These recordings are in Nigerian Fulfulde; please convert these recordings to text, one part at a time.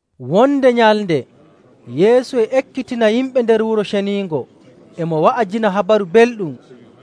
Wonde nyalnde, Yeesu e ekkitina yimɓe nder Wuro Ceniingo, e mo wa'ajina Habaru Belɗum,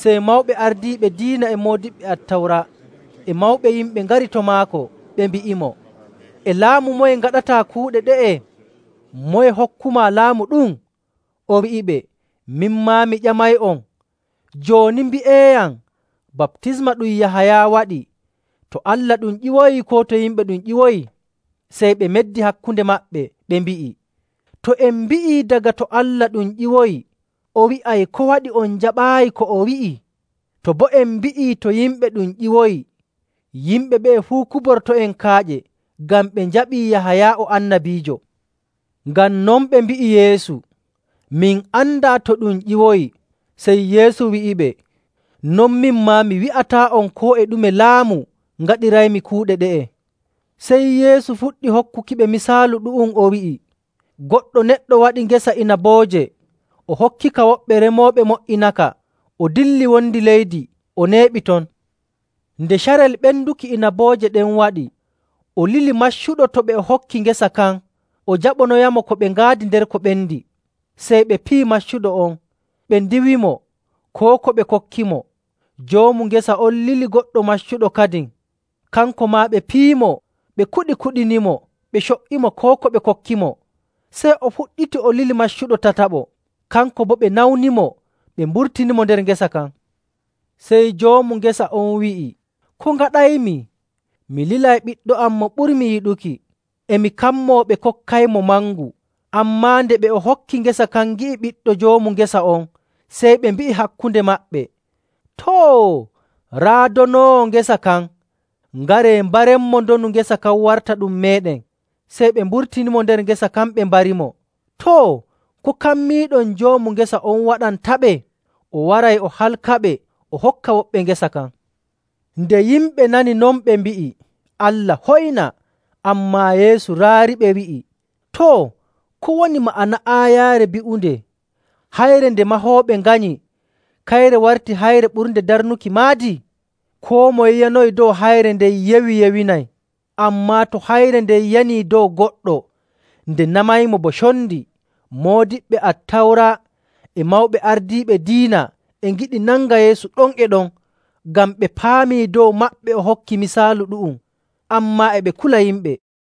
sey mawɓe ardiiɓe diina e moodiɓɓe Attawra e mawɓe yimɓe ngari to maako, ɓe mbi'imo, “E laamu moye ngaɗataa kuuɗe ɗe'e? Moye hokkumaa laamu ɗum?” O wi'iɓe, “Min maa mi ƴamay'on, jooni mbi'eeyam, baptisma ɗum Yahaya waɗi, to Allah ɗum ƴiwoyi koo to yimɓe ɗum ƴiwoyi?” Sey ɓe meddi hakkunde maɓɓe, ɓe mbi'i, “To en mbi'ii, ‘Daga to Allah ɗum ƴiwoyi,’ o wi'ay, ‘Ko waɗi on jaɓaayi ko o wi'i?’ To boo en mbi'ii, ‘To yimɓe ɗum ƴiwoyi,’ yimɓe ɓe'e fuu kuborto'en kaaƴe, ngam ɓe njaɓii Yahaya o annabiijo.” Ngam non ɓe mbi'i Yeesu, “Min andaa to ɗum ƴiwoyi.” Sey Yeesu wi'iɓe, “Non min maa, mi wi'ataa'on koo e ɗume laamu ngaɗiraymi kuuɗe ɗe'e.” Sey Yeesu fuɗɗi hokkuki yimɓe misaalu ɗu'um, o wi'i, “Goɗɗo neɗɗo waɗi ngesa inabooje, o hokkika woɓɓe remooɓe mo''inaka, o dilli wondi leydi o neeɓi ton.. Nde carel ɓenduki inabooje ɗen waɗi, o lili maccuɗo to ɓe o hokki ngesa kan o jaɓonoyamo ko ɓe ngaadi nder ko ɓendi. Sey ɓe piyi maccuɗo on ɓe ndiiwimo koo ko ɓe kokkimo. Joomu ngesa on lili goɗɗo maccuɗo kadin, kanko maa ɓe piyimo ɓe kuɗi kuɗinimo, ɓe co''imo, koo ko ɓe kokkimo. Sey o fuɗɗiti o lili maccuɗo tataɓo, kanko boo ɓe nawnimo ɓe mburtinimo nder ngesa kan. Sey joomu ngesa on wi'i, ‘Ko ngaɗaymi? Mi lilay ɓiɗɗo am mo ɓurmi yiɗuki. E mi kammoo ɓe kokkaymo mangu.’ Ammaa nde ɓe o hokki ngesa kan ngi'i ɓiɗɗo joomu ngesa on, sey ɓe mbi'i hakkunde maɓɓe, ‘Too! Raa donoowo ngesa kan. Ngaree mbarenmo, ndonu ngesa kan warta ɗum meeɗen.’ Sey ɓe mburtinimo nder ngesa kan ɓe mbarimo. “Too, ko kammiiɗon joomu ngesa on waɗantaɓe? O waray o halkaɓe, o hokka woɓɓe ngesa kan.” Nde yimɓe nani non, ɓe mbi'i, “Allah hoyna!” Ammaa Yeesu raariɓe wi'i, “Too, ko woni ma'ana aayaare bi'unde: ‘Hayre nde mahooɓe nganyi, kayre warti hayre ɓurnde darnuki maadi?’. “Koo moye yanoyi dow hayre nden yewi yewinay; ammaa to hayre nden yanii dow goɗɗo, nde namaymo bo condi.” Moodiɓɓe Attawra e mawɓe ardiiɓe diina e ngiɗi nanga Yeesu ɗon e ɗon, ngam ɓe paamii dow maɓɓe o hokki misaalu ɗu'um, ammaa e ɓe kula yimɓe.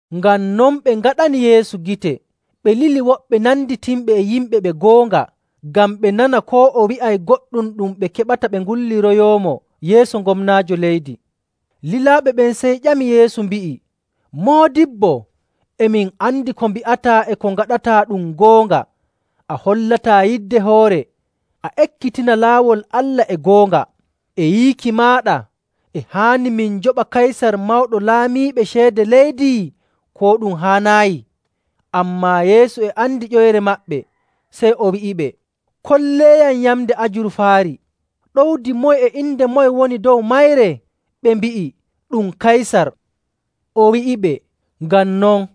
Ngam non ɓe ngaɗani Yeesu gite, ɓe lili woɓɓe nanditinɓe e yimɓe ɓe goonga ngam ɓe nana koo o wi'ay goɗɗum ɗum ɓe keɓata ɓe ngulliroyoomo yeeso gomnaajo leydi. Lilaaɓe ɓen sey ƴami Yeesu mbi'i, “Moodibbo, e min andi ko mbi'ataa e ko ngaɗataa ɗum goonga, a hollataa yidde hoore, a ekkitina laawol Allah e goonga. E yiiki maaɗa e haani min njoɓa Kaysar Mawɗo Laamiiɓe ceede leydi, koo ɗum haanaayi?” Ammaa Yeesu e andi ƴoyre maɓɓe, sey o wi'iɓe, “Kolleeyam yamnde ajurfaari. Ɗowdi moye e inde moye woni dow mayre?” Ɓe mbi'i, “Ɗum Kaysar.” O wi'iɓe, “Ngam non,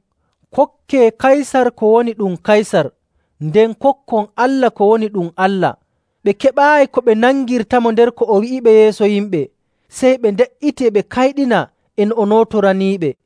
kokkee Kaysar ko woni ɗum Kaysar, nden kokkon Allah ko woni ɗum Allah.” Ɓe keɓaayi ko ɓe nangirtamo nder ko o wi'iɓe yeeso yimɓe, sey ɓe nde''iti e ɓe kayɗina e no o nootoraniiɓe.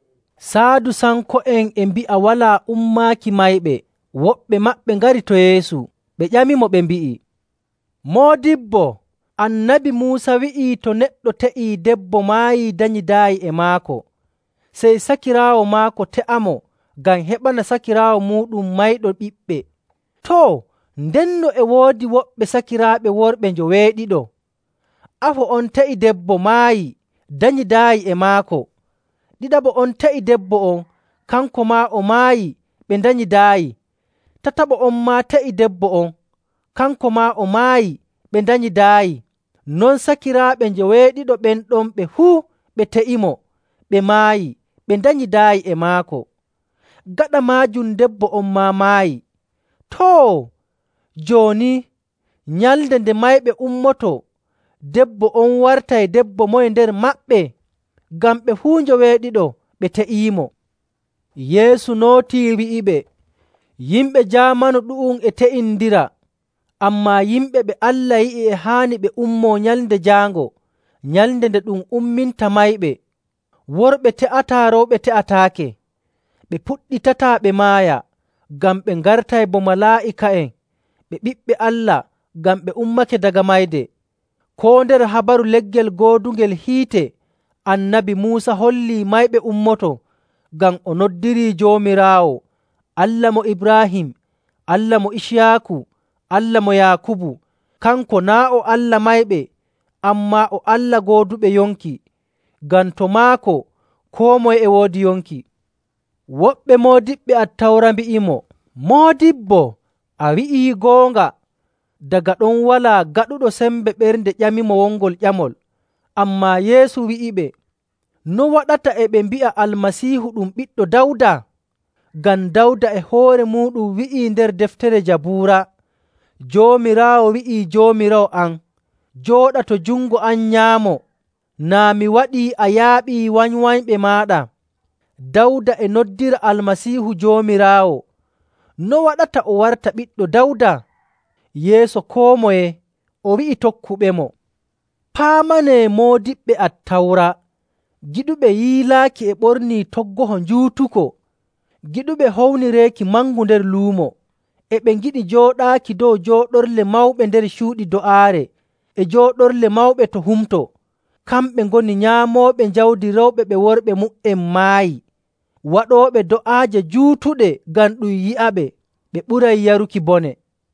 Saadusanko'en e mbi'a walaa ummaaki mayɓe. Woɓɓe maɓɓe ngari to Yeesu,. ɓe ƴamimo, ɓe mbi'i, “Moodibbo, Annabi Muusa wi'ii to neɗɗo te'ii debbo maayii danyidaayi e maako, sey sakiraawo maako te'amo ngam heɓana sakiraawo muuɗum mayɗo ɓiɓɓe.. Too, ndenno e woodi woɓɓe sakiraaɓe worɓe njoweeɗiɗo. Afo on te'i debbo, maayi, danyidaayi e maako. Ɗiɗaɓo on te'i debbo on, kanko maa o maayi, ɓe ndanyidaayi. Tataɓo on maa te'i debbo on, kanko maa o maayi ɓe ndanyidaayi. Non sakiraaɓe njoweeɗiɗo ɓen ɗon ɓe fuu ɓe te'iinomo, ɓe maayi, ɓe ndanyidaayi e maako. Gaɗa maajum debbo on maa maayi. Too, jooni, nyalnde nde mayɓe ummotoo, debbo on wartay debbo moye nder maɓɓe? Ngam ɓe fuu njoweeɗiɗo ɓe te'iimo.” Yeesu nootii wi'iɓe, “Yimɓe jaamanu ɗu'um e te'indira, ammaa yimɓe ɓe Allah yi'i e haani ɓe ummoo Nyalnde Jaango, nyalnde nde ɗum umminta mayɓe, worɓe te'ataa, rewɓe te'ataake. Ɓe puɗɗitataa ɓe maaya, ngam ɓe ngartay bo malaa'ika'en. Ɓe ɓiɓɓe Allah ngam ɓe ummake daga mayde. Koo nder habaru leggel goodungel hiite, Annabi Muusa hollii mayɓe ummoto, ngam o noddirii Joomiraawo ‘Allah mo Ibraahim, Allah mo Iciyaaku, Allah mo Yaakubu.’. Kanko naa' o Allah mayɓe, ammaa o Allah gooduɓe yonki. Ngam to maako, koo moye e woodi yonki.” Woɓɓe moodiɓɓe Attawra mbi'imo, “Moodibbo, a wi'ii goonga.” Daga ɗon walaa gaɗuɗo sembe ɓernde ƴamimo wongol ƴamol. Ammaa Yeesu wi'iɓe, “No waɗata e ɓe mbi'a Almasiihu ɗum ɓiɗɗo Dawda? Ngam Dawda e hoore muuɗum wi'i nder deftere Jabuura, ‘Joomiraawo wi'ii Joomiraawo am, “Jooɗa to jungo am nyaamo, naa mi waɗii a yaaɓii wanywanyɓe maaɗa.”’. Dawda e noddira Almasiihu ‘Joomiraawo.’ No waɗata o warta ɓiɗɗo Dawda?” Yeeso koo moye o wi'i tokkuɓemo, “Paamanee moodiɓɓe Attawra, giɗuɓe yiilaaki e ɓornii toggoho njuutuko, giɗuɓe hownireeki mangu nder luumo. E ɓe ngiɗi jooɗaaki dow jooɗorle mawɓe nder cuuɗi do'aare e jooɗorle mawɓe to humto. Kamɓe ngoni nyaamooɓe jawdi rewɓe ɓe worɓe mu''en maayi, waɗooɓe do'aaje juutuɗe ngam ɗum yi'aɓe. Ɓe ɓuray yaruki bone.”